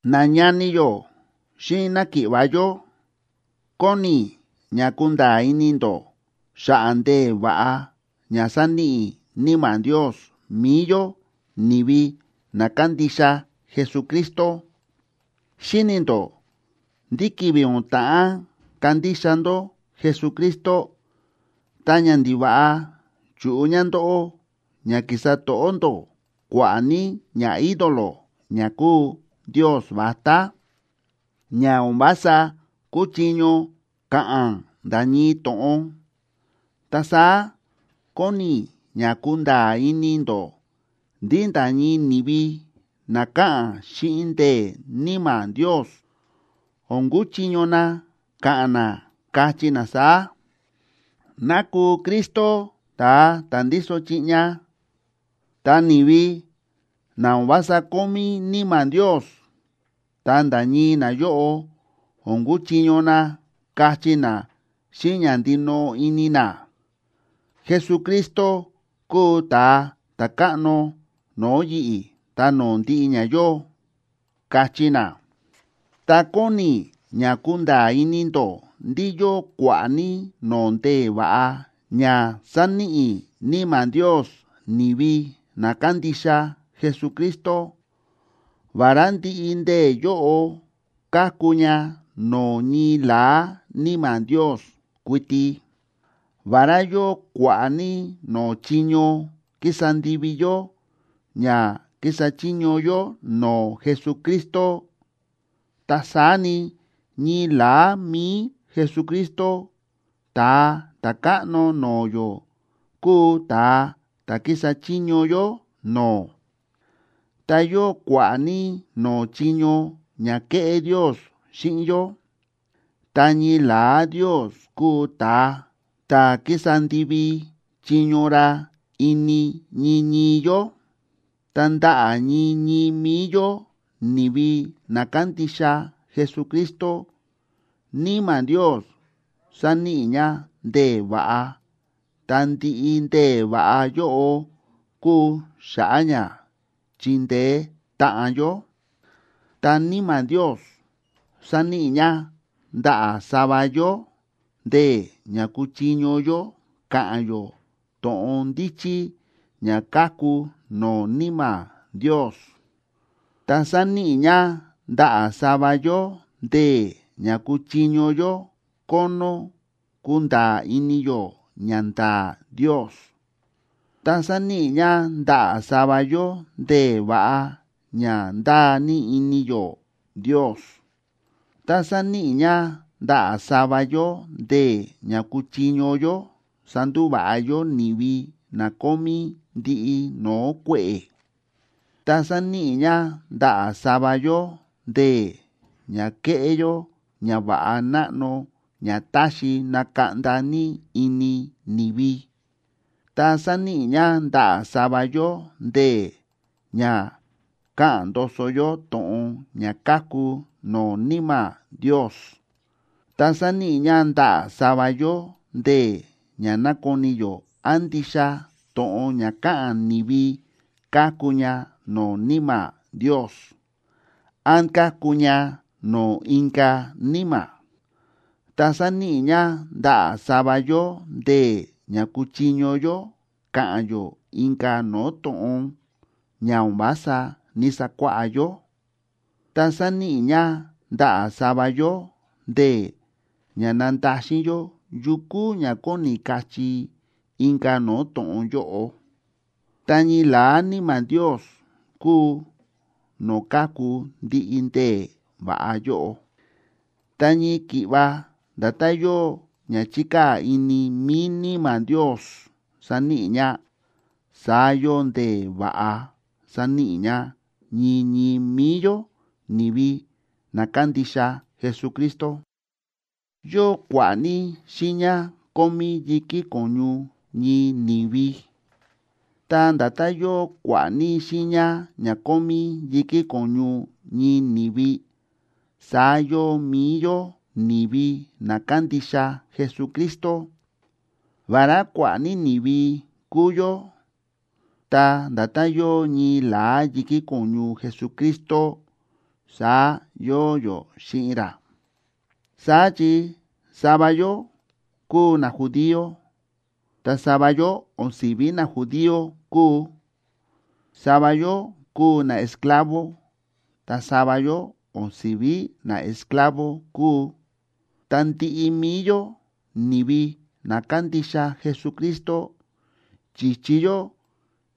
Nañani yó xíꞌin náki̱ꞌva̱ yó, kóni i̱ ña kunda̱a̱ ini ndó xa̱ꞌa̱ ndee̱ va̱ꞌa ña sáníꞌi Níma̱ Ndios mi̱i yó ni̱vi na kándixa Jesucristo. Xíni̱ ndó ndí ki̱vi̱ o̱n ta̱ꞌán kandixa ndó Jesucristo, ta ñandiva̱ꞌa chu̱ꞌu ña ndóꞌó ña ki̱sa to̱ꞌó ndó kua̱ꞌa̱ ní ñaídolo ña kúu ndios vatá, ña o̱n vása kúchiño ka̱ꞌa̱n nda̱ ñii to̱ꞌon. Ta saá kóni i̱ ña kunda̱a̱ ini ndó ndí nda̱ ñii ni̱vi na káꞌa̱n xíꞌin ndee̱ Níma̱ Ndios o̱n kuchiño na ka̱ꞌa̱n na, kachí na saá: “¡Ná kuu Jesucristo ta̱a ta̱ ndíso chiꞌña!” Ta ni̱vi na o̱n vása kómí Níma̱ Ndios, ta nda̱ ñii nayóꞌo o̱n kuchiño na kachí na xíꞌin ña ndinoꞌo ini na: “Jesucristo kúu Ta̱a Ta̱káꞌno no̱o̱ yi̱ꞌi̱ ta no̱o̱ ndiꞌi ña yóo”, kachí na. Ta kóni i̱ ña kunda̱a̱ ini ndó ndí yóo kua̱ꞌa̱ ní no̱o̱ ndee̱ va̱ꞌa ña sáníꞌi Níma̱ Ndios ni̱vi na kándixa Jesucristo, vará ndiꞌi ndee̱ yóꞌo káku ña no̱o̱ ñii la̱á Níma̱ Ndios kuiti. Vará yóo kua̱ꞌa̱ ní no̱o̱ chiño kísa ndivi yó ña kísa chiño yó no̱o̱ Jesucristo, ta saá ni, ñii la̱á mi̱i Jesucristo, Ta̱a Ta̱káꞌno no̱o̱ yó, kúu ta̱a ta̱ kísa chiño yó no̱o̱. Ta yóo kua̱ꞌa̱ ní no̱o̱ chiño ña kéꞌé Ndios xíꞌin yó, ta ñii la̱á Ndios kúu ta̱a ta̱ kísa ndivi chiño ra ini ñii ñii yó. Ta ndaꞌa̱ ñii ñii mi̱i yó ni̱vi na kándixa Jesucristo, Níma̱ Ndios sáníꞌi ña ndee̱ va̱ꞌa ta ndiꞌi ndee̱ va̱ꞌa yóꞌo kúu xa̱ꞌa̱ ña chindeé táꞌan yó. Ta Níma̱ Ndios sáníꞌi ña ndaꞌa̱ sava yó ndee̱ ña kúchiño yó ka̱ꞌa̱n yó to̱ꞌon ndíchí ña káku no̱o̱ Níma̱ Ndios. Ta sáníꞌi ña ndaꞌa̱ sava yó ndee̱ ña kúchiño yó kónó kunda̱a̱ ini yó ñanda̱a̱ Ndios. Ta sáníꞌi ña ndaꞌa̱ sava yó ndee̱ va̱ꞌa ña ndáa ní ini yó Ndios. Ta sáníꞌi ña ndaꞌa̱ sava yó ndee̱ ña kúchiño yó sandúva̱ꞌa yó ni̱vi na kómí ndiꞌi no̱o̱ kue̱ꞌe̱. Ta sáníꞌi ña ndaꞌa̱ sava yó ndee̱ ña kéꞌé yó ñava̱ꞌa náꞌno ña táxi nakaꞌnda ní ini ni̱vi. Ta sáníꞌi ña ndaꞌa̱ sava yó ndee̱ ña káꞌa̱n ndoso yó to̱ꞌon ña káku no̱o̱ Níma̱ Ndios. Ta sáníꞌi ña ndaꞌa̱ sava yó ndee̱ ña nákoni yó án ndixa to̱ꞌon ña káꞌa̱n ni̱vi káku ña no̱o̱ Níma̱ Ndios, án káku ña no̱o̱ inka̱ níma̱. Ta sáníꞌi ña ndaꞌa̱ sava yó ndee̱ ña kúchiño yó ka̱ꞌa̱n yó inka̱ no̱o̱ to̱ꞌon ña o̱n vása ní‑sakuáꞌá yó. Ta sáníꞌi ña ndaꞌa̱ sava yó ndee̱ ña nándaxin yó yu kúu ña kóni kachí inka̱ no̱o̱ to̱ꞌon yóꞌo. Ta ñii la̱á Níma̱ Ndios kúu no̱o̱ káku ndiꞌi ndee̱ va̱ꞌa yóꞌo. Ta ñii ki̱ꞌva nda̱tán yóo ña chíkaa̱ ini mi̱i Níma̱ Ndios saníꞌi ña, saá yóo ndee̱ va̱ꞌa sáníꞌi ña ñii ñii mi̱i yó, ni̱vi na kándixa Jesucristo. Yóo kua̱ꞌa̱ ní xiiña kómí yi̱kí ko̱ñu ñii ni̱vi. Ta nda̱tán yóo kua̱ꞌa̱ ní xiiña ña kómí yi̱kí ko̱ñu ñii ni̱vi, saá yóo mi̱i yó ni̱vi na kándixa Jesucristo. Vará kua̱ꞌa̱ ní ni̱vi kúu yó, ta nda̱tán yóo ñii la̱á yi̱kí ko̱ñu Jesucristo, saá yóo yó xíꞌin ra. Saá chi sava yó kúu najudío, ta sava yó o̱n si̱ví najudío kúu, sava yó kúu naesclavo, ta sava yó o̱n si̱ví naesclavo kúu, ta ndiꞌi mi̱i yó ni̱vi na kándixa Jesucristo chi̱chi yó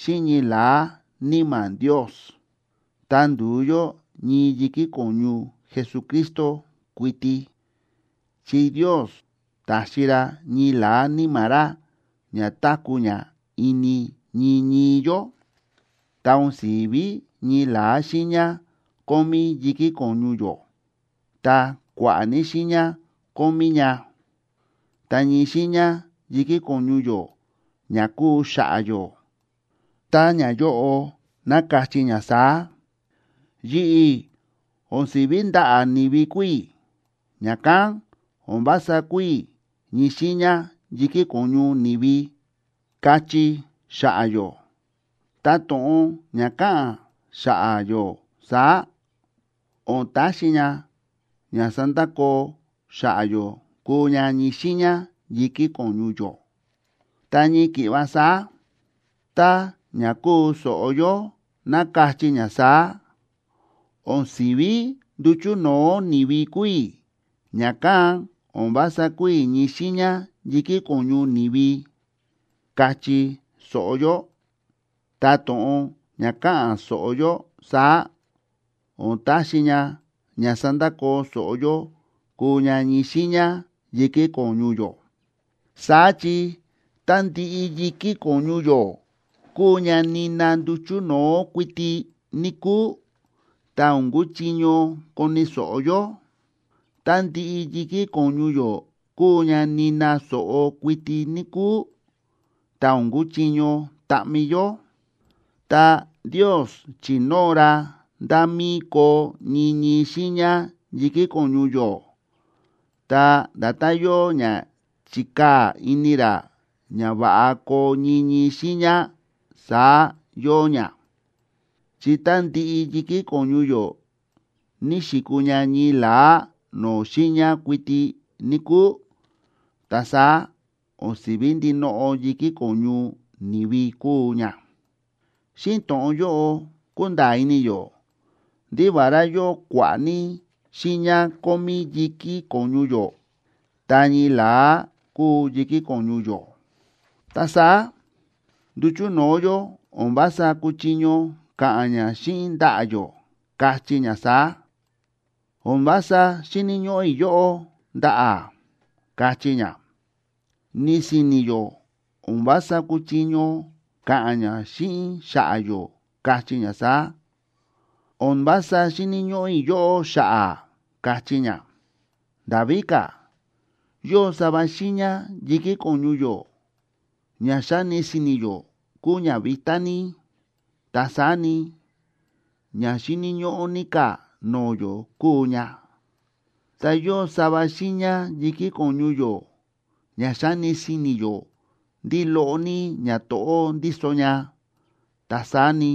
xíꞌin ñii la̱á Níma̱ Ndios, ta ndu̱u yó ñii yi̱kí ko̱ñu Jesucristo kuiti, chi Ndios ta̱xi ra ñii la̱á Níma̱ ra ña táku̱ ña ini ñii ñii yó. Ta o̱n si̱ví ñii la̱á xiiña kómí yi̱kí ko̱ñu yó, ta kua̱ꞌa̱ ní xiiña kómí ña. Ta ñii xiiña yi̱kí ko̱ñu yó ña kúu xa̱ꞌa̱ yó, tá ñayóꞌo ná kachí ña saá: “Yi̱ꞌi̱ o̱n si̱ví ndaꞌa̱ ni̱vi kúu i̱, ña̱kán o̱n vása kúu i̱ ñii xiiña yi̱kí ko̱ñu ni̱vi”, kachí xa̱ꞌa̱ yó, ta to̱ꞌon ña ka̱ꞌa̱n xa̱ꞌa̱ yó saá, o̱n taxi ña ña sandakoo xa̱ꞌa̱ yó kúu ña ñii xiiña yi̱kí ko̱ñu yó. Ta ñii ki̱ꞌva saá, tá ña kúu so̱ꞌo yó ná kachí ña saá: “O̱n si̱ví nduchu̱ no̱o̱ ni̱vi kúu i̱, ña̱kán o̱n vása kúu i̱ ñii xiiña yi̱kí ko̱ñu ni̱vi”, kachí so̱ꞌo yó, ta to̱ꞌon ña ka̱ꞌa̱n so̱ꞌo yó saá, o̱n taxi ña ña sandakoo so̱ꞌo yó kúu ña ñii xiiña yi̱kí ko̱ñu yó. Saá chi tá ndiꞌi yi̱kí ko̱ñu yó kuu ña nina nduchu̱ no̱o̱ kuiti, níkúu, ta o̱n kuchiño koni̱ so̱ꞌo yó. Tá ndiꞌi yi̱kí ko̱ñu yó kuu ña nina so̱ꞌo kuiti, níkúu, ta o̱n kuchiño taꞌmi yó. Ta Ndios chi̱nóo ra nda̱ mí koo ñii ñii xiiña yi̱kí ko̱ñu yó, ta nda̱tán yóo ña chi̱kaa̱ ini ra ña va̱ꞌa koo ñii ñii xiiña, saá yóo ña. Chi tá ndiꞌi yi̱kí ko̱ñu yó ní xi̱kuu ña ñii la̱á no̱o̱ xiiña kuiti, níkúu, ta saá o̱n si̱ví ndinoꞌo yi̱kí ko̱ñu ni̱vi kuu ña. Xíꞌin to̱ꞌon yóꞌo kúnda̱a̱ ini yó ndí vará yóo kua̱ꞌa̱ ní xiiña kómí yi̱kí ko̱ñu yó, ta ñii la̱á kúu yi̱kí ko̱ñu yó. Ta saá nduchu̱ no̱o̱ yó o̱n vása kúchiño ka̱ꞌa̱n ña xíꞌin ndaꞌa̱ yó, kachí ña saá: “O̱n vása xíni̱ ñóꞌó i̱ yóꞌó, ndaꞌa̱”, kachí ña. Ni si̱ni̱ yó o̱n vása kúchiño ka̱ꞌa̱n ña xíꞌin xa̱ꞌa̱ yó, kachí ña saá: “O̱n vása xíni̱ ñóꞌó i̱ yóꞌó, xa̱ꞌa̱”, kachí ña. Nda̱ víka̱, yóo sava xiiña yi̱kí ko̱ñu yó ña xáni si̱ni̱ yó kúu ña vitá ní, ta saá ni, ña xíni̱ ñóꞌó ní ka̱ no̱o̱ yó kúu ña. Ta yóo sava xiiña yi̱kí ko̱ñu yó ña xáni si̱ni̱ yó ndí loꞌo ní ñato̱ꞌó ndíso ña, ta saá ni,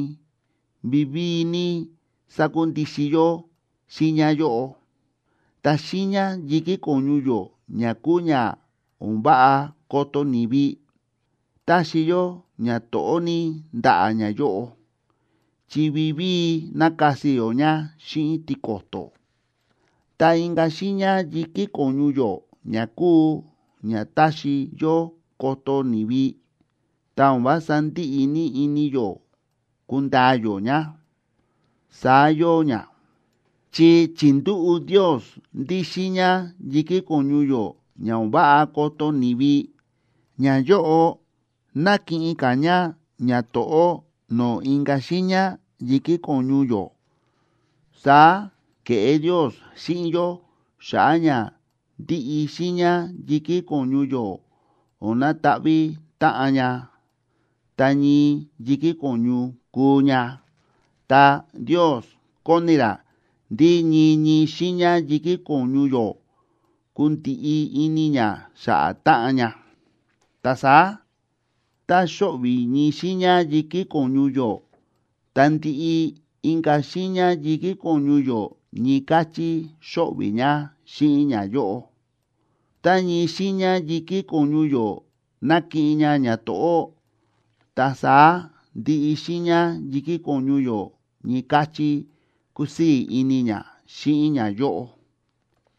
vivíi ní sákundixin yó xiiña yóꞌo. Ta xiiña yi̱kí ko̱ñu yó ña kúu ña o̱n váꞌa koto ni̱vi, táxi yó ñato̱ꞌó ní ndaꞌa̱ ñayóꞌo, chi vivíi nákasi yó ña xíꞌin tiko̱to̱. Ta inka̱ xiiña yi̱kí ko̱ñu yó ña kúu ña táxi yó koto ni̱vi, ta o̱n vása ndíꞌi ní ini yó kundaa yó ña. Saá yóo ña, chi chi̱ndúꞌu̱ Ndios ndí xiiña yi̱kí ko̱ñu yó ña o̱n váꞌa koto ni̱vi, ñayóꞌo nákiꞌin ka̱ ña ñato̱ꞌó no̱o̱ inka̱ xiiña yi̱kí ko̱ñu yó. Saá ke̱ꞌé Ndios xíꞌin yó xa̱ꞌa̱ ña ndiꞌi xiiña yi̱kí ko̱ñu yó o̱n nataꞌví táꞌan ña, ta ñii yi̱kí ko̱ñu kuu ña. Ta Ndios kóni ra ndí ñii ñii xiiña yi̱kí ko̱ñu yó kundiꞌi ini ña xa̱ꞌa̱ táꞌan ña. Ta saá tá xóꞌvi̱ ñii xiiña yi̱kí ko̱ñu yó, ta ndiꞌi inka̱ xiiña yi̱kí ko̱ñu yó ñii káchí xóꞌvi̱ ña xíꞌin ñayóꞌo. Tá ñii xiiña yi̱kí ko̱ñu yó nákiꞌin ña ñato̱ꞌó, ta saá ndiꞌi xiiña yi̱kí ko̱ñu yó ñii káchí kúsii̱ ini ña xíꞌin ñayóꞌo.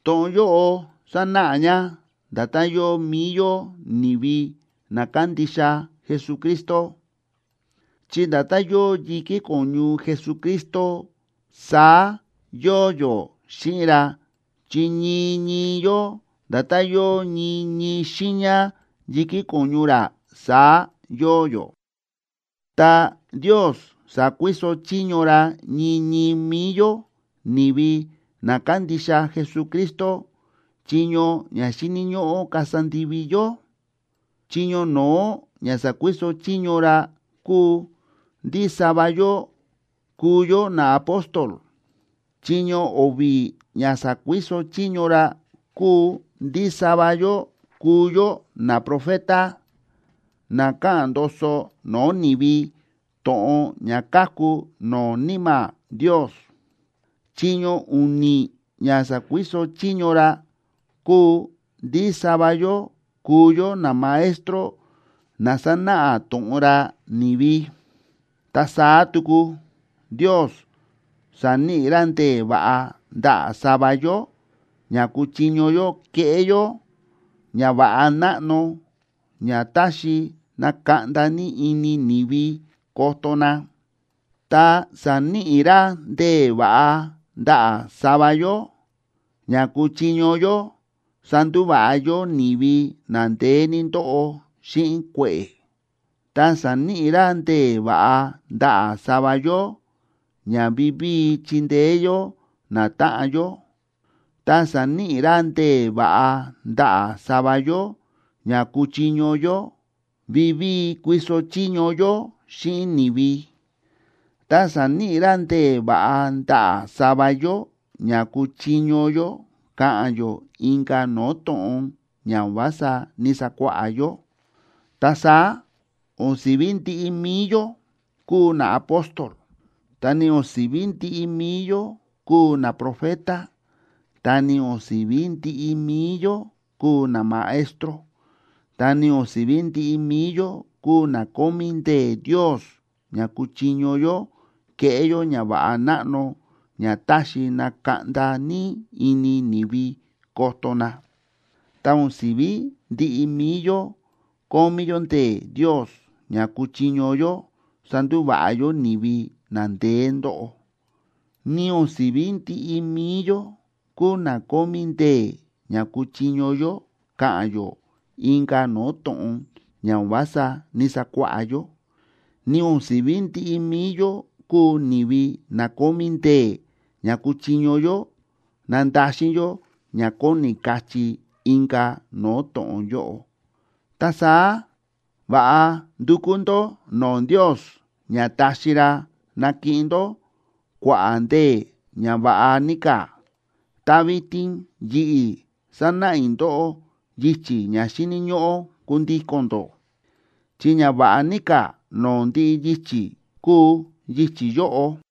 To̱ꞌon yóꞌo sánáꞌa ña nda̱tán yóo mi̱i yó ni̱vi na kándixa Jesucristo, chi nda̱tán yóo yi̱kí ko̱ñu Jesucristo, saá yóo yó xíꞌin ra, chi ñii ñii yó nda̱tán yóo ñii ñii xiiña yi̱kí ko̱ñu ra, saá yóo yó. Ta Ndios sa̱kuiso chiño ra ñii ñii mi̱i yó ni̱vi na kándixa Jesucristo chiño ña xíni̱ ñóꞌó kasa ndivi yó. Chiño no̱ó ña sa̱kuiso chiño ra kúu ndí sava yó kúu yó naapóstol. Chiño o̱vi̱ ña sa̱kuiso chiño ra kúu ndí sava yó kúu yó naprofeta na káꞌa̱n ndoso no̱o̱ ni̱vi to̱ꞌon ña káku no̱o̱ Níma̱ Ndios. Chiño u̱ni̱ ña sa̱kuiso chiño ra kúu ndí sava yó kúu yó namaestro na sánáꞌa to̱ꞌon ra ni̱vi. Ta saá tuku Ndios sa̱níꞌi ra ndee̱ va̱ꞌa ndaꞌa̱ sava yó ña kúchiño yó keꞌé yó ñava̱ꞌa náꞌno ña táxi nakaꞌnda ní ini ni̱vi koto na. Ta sa̱níꞌi ra ndee̱ va̱ꞌa ndaꞌa̱ sava yó ña kúchiño yó sandúva̱ꞌa yó ni̱vi na ndeé ní ndóꞌo xíꞌin kue̱ꞌe̱. Ta sa̱níꞌi ra ndee̱ va̱ꞌa ndaꞌa̱ sava yó ña vivíi chíndeé yó natáꞌan yó. Ta sa̱níꞌi ra ndee̱ va̱ꞌa ndaꞌa̱ sava yó ña kúchiño yó vivíi kuiso chiño yó xíꞌin ni̱vi. Ta sa̱níꞌi ra ndee̱ va̱ꞌa ndaꞌa̱ sava yó ña kúchiño yó ka̱ꞌa̱n yó inka̱ no̱o̱ to̱ꞌon ña o̱n vása ní‑sakuáꞌá yó. Ta saá o̱n si̱ví ndiꞌi mi̱i yó kúu naapóstol, ta ni o̱n si̱ví ndiꞌi mi̱i yó kúu naprofeta, ta ni o̱n si̱ví ndiꞌi mi̱i yó kúu namaestro, ta ni o̱n si̱ví ndiꞌi mi̱i yó kúu na kómí ndee̱ Ndios ña kúchiño yó keꞌé yó ñava̱ꞌa náꞌno ña táxi nakaꞌnda ní ini ni̱vi koto na. Ta o̱n si̱ví ndiꞌi mi̱i yó kómí yó ndee̱ Ndios ña kúchiño yó sandúva̱ꞌa yó ni̱vi na ndeé ndóꞌo, ni o̱n si̱ví ndiꞌi mi̱i yó kúu na kómí ndee̱ ña kúchiño yó ka̱ꞌa̱n yó inka̱ no̱o̱ to̱ꞌon ña o̱n vása ní‑sakuáꞌá yó, ni o̱n si̱ví ndiꞌi mi̱i yó kúu ni̱vi na kómí ndee̱ ña kúchiño yó nandaxin yó ña kóni kachí inka̱ no̱o̱ to̱ꞌon yóꞌo. Ta saá va̱ꞌa ndukú ndó no̱o̱ Ndios ña taxi ra nakiꞌin ndó kua̱ꞌa̱ ndee̱ ña va̱ꞌa ní ka̱. Ta vitin yi̱ꞌi̱ sanáꞌa i̱ ndóꞌó yichi̱ ña xíni̱ ñóꞌó kundíko̱n ndó, chi ña va̱ꞌa ní ka̱ no̱o̱ ndiꞌi yichi̱ kúu yichi̱ yóꞌo.